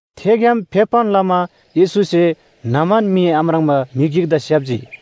थेग्‍याम फेप्‍बान लमा येशूसे न्‍हमान मी आम्राङ्बा म्‍हि गिकदा स्‍याप्‍जी।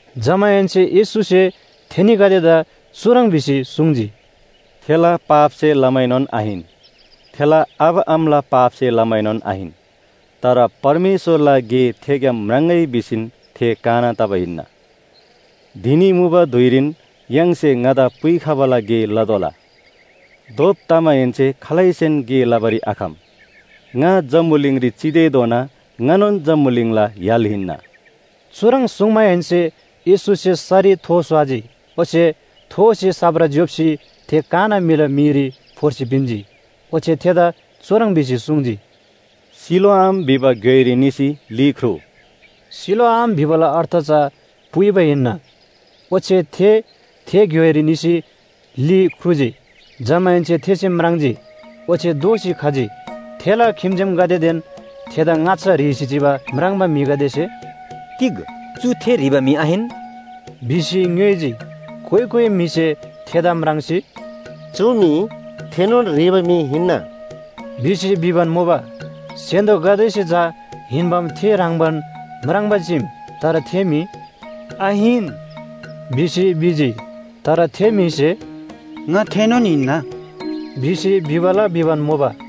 जमाहेन्‍से येशूसे थेनीगदेदा चुह्रङ् भिसी सुङ्जी, “थेला पापसे लमाएनोन आहिन, थेला आबा आमाला पापसे लमाएनोन आहिन। तर परमेश्‍वरला गे थेग्‍याम म्राङ्‍गै भिसीन थे काना तबा हिन्‍ना। धिनी मुबा धुइरीन य्‍हाङसे ङादा पुइखबाला गे लतोःला। धोप तमाहेन्‍से खालैसेन गे लबारी आखम। ङा जम्‍बुलिङरी चितेधोना ङानोन जम्‍बुलिङला य्‍हाल हिन्‍ना।” चुह्रङ् सुङ्माहेन्‍से येशूसे सरी थो स्‍वाजी, ओच्‍छे थोसे साप्रा ज्‍योप्‍सी थे काना म्‍हिला मीरी फोर्सी पिन्‍जी। ओच्‍छे थेदा चुह्रङ् भिसी सुङ्जी, “सिलोआम भिबा घ्‍योइरी निसी ली ख्रुउ।” सिलोआम भिबाला अर्थ चा पुइबा हिन्‍ना। ओच्‍छे थे, थे घ्‍योइरी निसी ली ख्रुजी। जमाहेन्‍से थेसे म्राङ्जी, ओच्‍छे दोःसी खजी। थेला खिम्‍जेमगदेदेन थेदा ङाच्‍छा ह्रीसी चिबा म्राङ्बा म्‍हिगदेसे “तिग चु थे ह्रीबा म्‍हि आहिन?” भिसी ङ्‌योइजी। कोइ कोइ म्‍हिसे थेदा म्राङ्सी, “चु मी थेनोन ह्रीबा म्‍हि हिन्‍ना” भिसी भिबान मुबा। स्‍य्‍हान्‍दोगदेसे चा हिन्‍बाम थे ह्रङ्‌बान म्राङ्बा चीम, तर थे म्‍हि “आहिन” भिसी भिजी। तर थे म्‍हिसे “ङा थेनोन हिन्‍ना” भिसी भिबाला भिबान मुबा।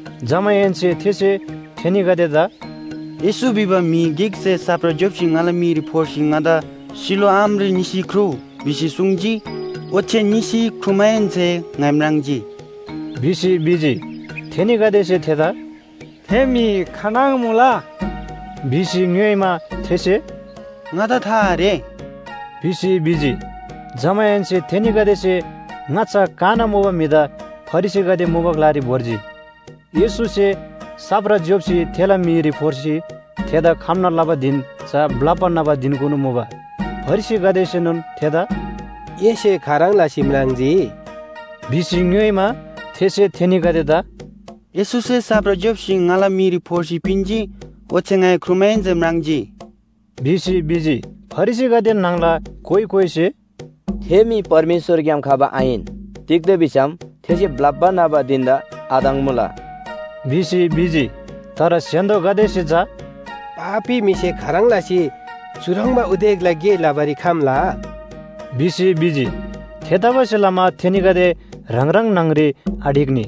जमाहेन्‍से थेसे थेनीगदेदा “येशू भिबा म्‍हि गिकसे साप्रा ज्‍योप्‍सी ङाला मीरी फोर्सी ङादा ‘सिलोआमरी निसी ख्रुउ’ भिसी सुङ्जी। ओच्‍छे निसी ख्रुमाहेन्‍से ङाइ म्राङ्जी” भिसी भिजी। थेनीगदेसे थेदा “थे म्‍हि खानङ मुला?” भिसी ङ्‌योइमा, थेसे “ङादा था आरे” भिसी भिजी। जमाहेन्‍से थेनीगदेसे ङाच्‍छा काना मुबा म्‍हिदा फरिसीगदे मुबा ग्‍लारी भोर्जी। येशूसे साप्रा ज्‍योप्‍सी थेला मीरी फोर्सी थेदा खम्‍ना लबा धिन चा ब्‍लप्‍बा न्‍हबा धिनकुनु मुबा। फरिसीगदेसेनोन थेदा “एसे खाह्रङ् लसी म्राङ्जी?” भिसी ङ्‌योइमा, थेसे थेनीगदेदा “येशूसे साप्रा ज्‍योप्‍सी ङाला मीरी फोर्सी पिन्‍जी, ओच्‍छे ङाइ ख्रुमाहेन्‍से म्राङ्जी” भिसी भिजी। फरिसीगदे न्‍हङला कोइ कोइसे “थे म्‍हि परमेश्‍वरग्‍याम खबा आहिन। तिग्‍दा भिसम थेसे ब्‍लप्‍बा न्‍हबा धिन‍दा आधङ्‍मुला” भिसी भिजी। तर स्‍य्‍हान्‍दोगदेसे चा “पापी म्‍हिसे खाह्रङ् लसी चुह्रङ्बा उदेकला गे लबारी खम्‍ला?” भिसी भिजी। थेतबासेलमा थेनीगदे ह्राङ ह्राङ न्‍हङ‍री आढिक्‍नी।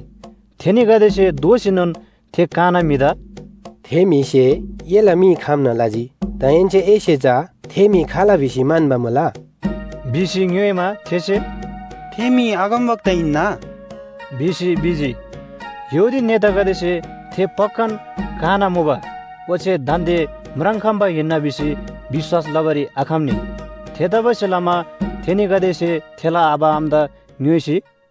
थेनीगदेसे दोःसीनोन थे काना म्‍हिदा “थे म्‍हिसे एला मी खम्‍ना लजी, दाहेन्‍से एसे चा थे म्‍हि खाल भिसी म्‍हन्‍बा मुला” भिसी ङ्‌योइमा, थेसे “थे म्‍हि अगमवक्ता हिन्‍ना” भिसी भिजी। यहूदी नेतागदेसे थे पक्‍कान काना मुबा, ओच्‍छे दान्‍दे म्राङ्‌खम्‍बा हिन्‍ना भिसी विश्‍वास लबारी आखम्‍नी। थेतबासेलमा थेनीगदेसे थेला आबा आमादा ङ्‌योइसी,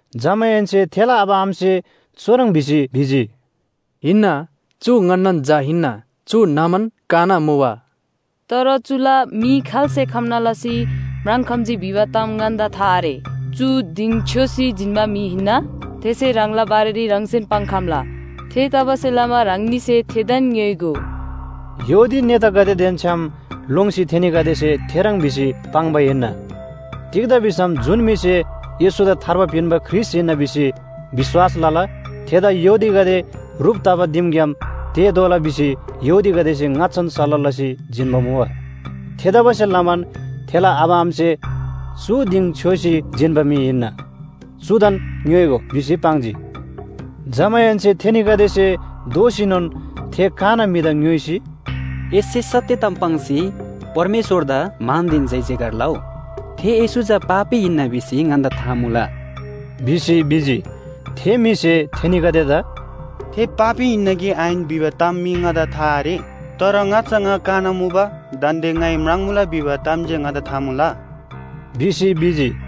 जमाहेन्‍से थेला आबा आमासे चुह्रङ् भिसी भिजी, “हिन्‍ना, चु ङन्‍नान झा हिन्‍ना, चु न्‍हमान काना मुबा। तर चुला मी खाल्‍से खम्‍ना लसी म्राङ्‌खम्‍जी भिबा ताम ङन्‍दा था आरे। चु दिङ छ्‍योसी जिन्‍बा म्‍हि हिन्‍ना, थेसे ह्राङला बारेरी ह्राङसेन पाङ्‌खम्‍ला। थेतबासेलमा ह्राङनीसे थेदान ङ्‌योइगो।” यहूदी नेतागदेदेन छ्‌याम लोङ्सी थेनीगदेसे थेह्रङ् भिसी पाङ्बा हिन्‍ना। तिग्‍दा भिसम जुन म्‍हिसे येशूदा थार्बा पिन्‍बा ख्रीष्‍ट हिन्‍ना भिसी विश्‍वास लला थेदा यहूदीगदे ह्रुप तबा दिमग्‍याम तेःतोःला भिसी यहूदीगदेसे ङाच्‍छान सल्‍लाह लसी जिन्‍बा मुबा। थेतबासेलमान थेला आबा आमासे “चु दिङ छ्‍योसी जिन्‍बा म्‍हि हिन्‍ना, चुदान ङ्‌योइगो” भिसी पाङ्जी। जमाहेन्‍से थेनीगदेसे दोःसीनोन थे काना म्‍हिदा ङ्‌योइसी, “एसे सत्‍य ताम पाङ्सी परमेश्‍वरदा मानदेन जयजयकार लउ, थे येशू चा पापी हिन्‍ना भिसी ङन्‍दा था मुला” भिसी भिजी। थे म्‍हिसे थेनीगदेदा “थे पापी हिन्‍ना कि आहिन भिबा ताम मी ङादा था आरे। तर ङाच्‍छा ङा काना मुबा, दान्‍दे ङाइ म्राङ्‌मुला भिबा ताम जे ङादा था मुला” भिसी भिजी।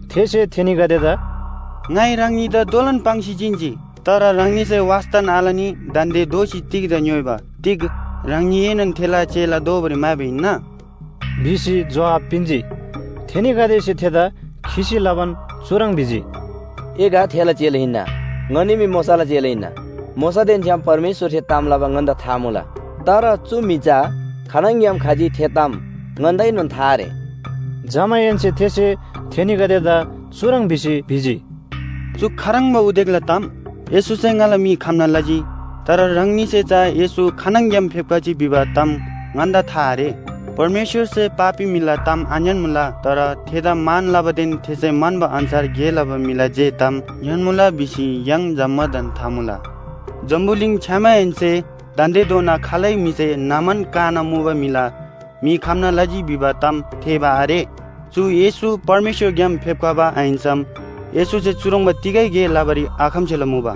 थेसे थेनीगदेदा “ङाइ ह्राङनीदा दोलोन पाङ्सी जिन्‍जी, तर ह्राङनीसे वास्‍तान आलनी दान्‍दे दोःसी तिग्‍दा ङ्‌योइबा, तिग ह्राङनीएनोन थेला चेला दोबारी म्‍हाइबा हिन्‍ना?” भिसी जोहाब पिन्‍जी। थेनीगदेसे थेदा खिसी लबान चुह्रङ् भिजी, “ए गा थेला चेला हिन्‍ना, ङनी मी मोशाला चेला हिन्‍ना। मोशादेन छ्‌याम परमेश्‍वरसे ताम लबा ङन्‍दा था मुला, तर चु म्‍हि चा खानङग्‍याम खजी थे ताम ङन्‍दाएनोन था आरे।” जमाहेन्‍से थेसे थेनीगदेदा चुह्रङ् भिसी भिजी, “चु खाह्रङ्बा उदेकला ताम! येशूसे ङाला मी खम्‍ना लजी। तर ह्राङनीसे चा येशू खानङग्‍याम फेप्‍खजी भिबा ताम ङन्‍दा था आरे। परमेश्‍वरसे पापी म्‍हिला ताम आङ्‌यान्‍मुला, तर थेदा मान लबादेन थेसे म्‍हन्‍बा अन्‍छार गे लबा म्‍हिला जे ताम ङ्‍यान्‍मुला भिसी य्‍हाङ जम्‍मादान था मुला। जम्‍बुलिङ छ्‌यामाहेन्‍से दान्‍देधोना खालै म्‍हिसे न्‍हमान काना मुबा म्‍हिला मी खम्‍ना लजी भिबा ताम थेःबा आरे। चु येशू परमेश्‍वरग्‍याम फेप्‍खबा आहिन्‍सम येशूसे चुह्रङ्बा तिगै गे लबारी आखम्‍सेला मुबा।”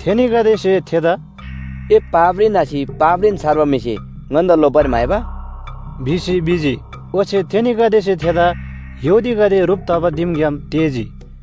थेनीगदेसे थेदा “ए पापरी न्‍हसी पापरीन छर्बा म्‍हिसे ङन्‍दा लोप्‍बारी म्‍हाइबा?” भिसी भिजी। ओच्‍छे थेनीगदेसे थेदा यहूदीगदे ह्रुप तबा दिमग्‍याम तेःजी।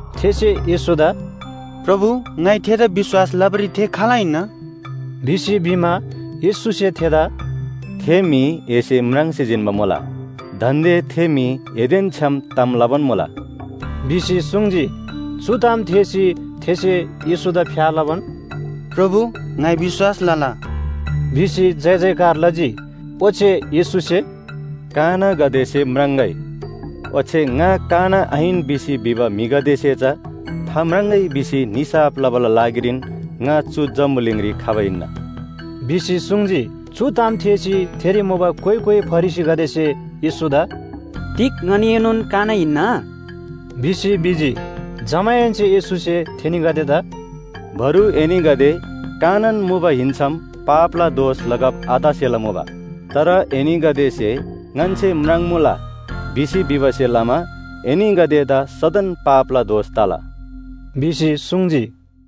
थेसे येशूदा “प्रभु, ङाइ थेदा विश्‍वास लबारी थे खाल हिन्‍ना?” भिसी भिमा, येशूसे थेदा “थे म्‍हि एसे म्राङ्सी जिन्‍बा मुला, दान्‍दे थे म्‍हि एदेन छ्‌याम ताम लबान मुला” भिसी सुङ्जी। चु ताम थेःसी थेसे येशूदा फ्‍या लबान, “प्रभु, ङाइ विश्‍वास लला” भिसी जयजयकार लजी। ओच्‍छे येशूसे, “कानागदेसे म्राङ्‍गै, ओच्‍छे ङा काना आहिन भिसी भिबा म्‍हिगदेसे चा थाम्राङ्‍गै भिसी निसाफ लबाला लागिरीन ङा चु जम्‍बुलिङरी खबा हिन्‍ना” भिसी सुङ्जी। चु ताम थेःसी थेरी मुबा कोइ कोइ फरिसीगदेसे येशूदा “तिग ङनीएनोन काना हिन्‍ना?” भिसी भिजी। जमाहेन्‍से येशूसे थेनीगदेदा “बरु एनीगदे कानान मुबा हिन्‍सम पापला दोष लगब आतसेला मुबा, तर एनीगदेसे ‘ङन्‍से म्राङ्‌मुला’ भिसी भिबासे लमा एनीगदेदा सदन पापला दोष तला” भिसी सुङ्जी।